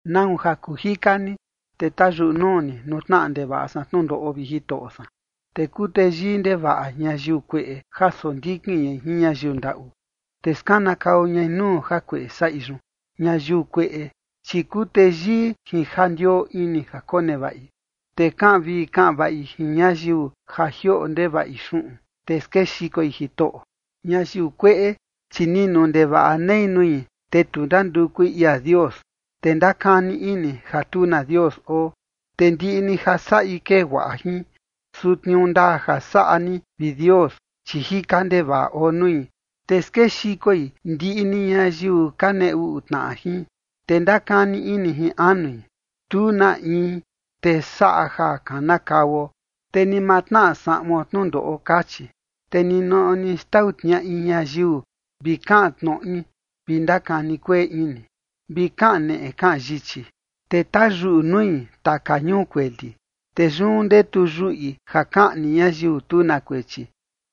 ¿Nau ja kuu jika ni, te tayuꞌu nuu ni nuu tnaꞌa ndevaꞌa san tnundoꞌo, vi Jitoꞌo san? Te kuu teyii ndevaꞌa ñayiu kueꞌe ja sondikin ñai jin ñayiu ndaꞌu, te skanakau ñai nuu jakueꞌe saꞌi yun. Ñayiu kueꞌe, chi kuu teyii jin ja ndioo ini ja konevaꞌi, te kaꞌan vii kaꞌan vaꞌi jin ñayiu ja jioꞌo ndevaꞌi xuꞌun, te skexikoi Jitoꞌo. Ñayiu kueꞌe, chi ninu ndevaꞌa nei nui, te tu ndandukui ia Dios, te ndakani ini ja tu na Dios oo. Te ndiꞌi ni ja saꞌi kee guaꞌa jin, su tniuu ndaa ja saꞌa ni, vi Dios, chi jika ndevaꞌa oo nui, te skexikoi ndiꞌi ni ñayiu ka nee uꞌu tnaꞌa jin. Te ndakani ini jin anui: “Tu na in, te saꞌa ja kanakauo, te ni ma tnaꞌa saꞌuon tnundoꞌo”, kachi. Te ninoꞌo ni xtau tniaꞌi ñayiu vi kaꞌan tnoꞌi vi ndakani kueꞌe ini, vi kaꞌan neꞌe kaꞌan yichi. Te tayuꞌu nui taka ñuu kueli, te yun ndetu yuꞌi ja kaꞌni ñayiu tu na kuechi,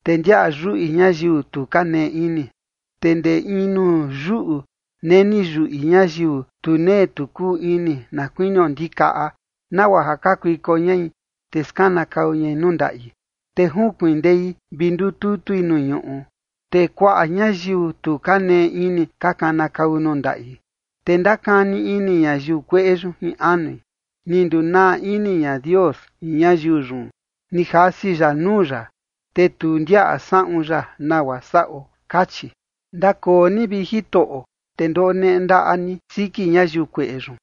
te ndiaꞌa yuꞌi ñayiu tu ka nee ini. Te ndee in nuu yuꞌu neni yuꞌi ñayiu tu nee tu kuu ini, na kuinio ndikaꞌa, nagua ja kakuiko ñai, te skanakau ñai nuu ndaꞌi. Te jinkuindei vi ndututui nuu ñuꞌu, te kuaꞌa ñayiu tu ka nee ini ka kanakau nuu ndaꞌi. Te ndakani ini ñayiu kueꞌe yun jin anui: “Ni ndunaa ini ña Dios jin ñayiu yun, ni jasi ya nuu ya, te tu ndiaꞌa saꞌun ya nagua saꞌo”, kachi. Ndakoo ni, vi Jitoꞌo, te ndoneꞌe ndaꞌa ni siki ñayiu kueꞌe yun,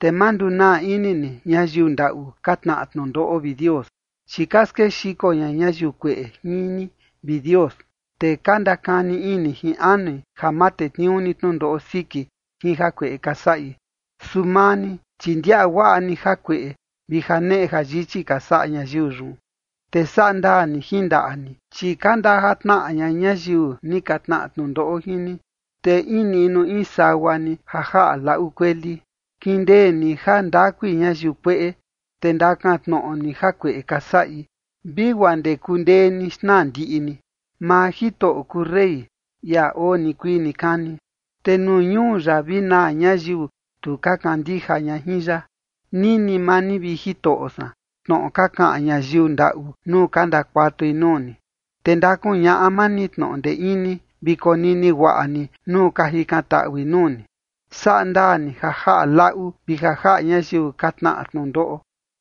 te ma ndunaa ini ni ñayiu ndaꞌu ka tnaꞌa tnundoꞌo, vi Dios. Chi ka skexiko ña ñayiu kueꞌe jin ni, vi Dios, te ka ndakani ini jin anui ja ma tetniuu ni tnundoꞌo siki jin jakueꞌe ka saꞌi. Su maa ni, chi ndiaꞌa guaꞌa ni jakueꞌe vi janeꞌe jayichi ka saꞌa ñayiu yun, te saꞌa ndaa ni jin ndaꞌa ni, chi ka ndajatnaꞌa ña ñayiu ni ka tnaꞌa tnundoꞌo jin ni, te in niꞌnu in sagua ni ja jaꞌa laꞌu kueli. Kindee ni jandakui ñayiu kueꞌe, te ndakantnoꞌo ni jakueꞌe ka saꞌi vi guaa ndee kundee ni xnaa ndiꞌi ni. Maa Jitoꞌo kuu rey, ia oo nikuii nikani, te nuu ñuu ya vi naa ñayiu tu ka kandija ña jin ya. Nini maa ni, vi Jitoꞌo san, tnoꞌo ka kaꞌan ñayiu ndaꞌu nuu ka ndakuatui nuu ni, te ndakuñaꞌa maa ni tnoꞌo ndee ini, vi konini guaꞌa ni nuu ka jikantaꞌui nuu ni. Saꞌa ndaa ni ja jaꞌa laꞌu vi ja jaꞌa ñayiu ka tnaꞌa tnundoꞌo,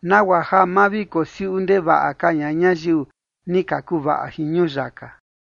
nagua ja ma vi kosiuꞌu ndevaꞌa ka ña ñayiu ni ka kuvaꞌa jin ñuyaka.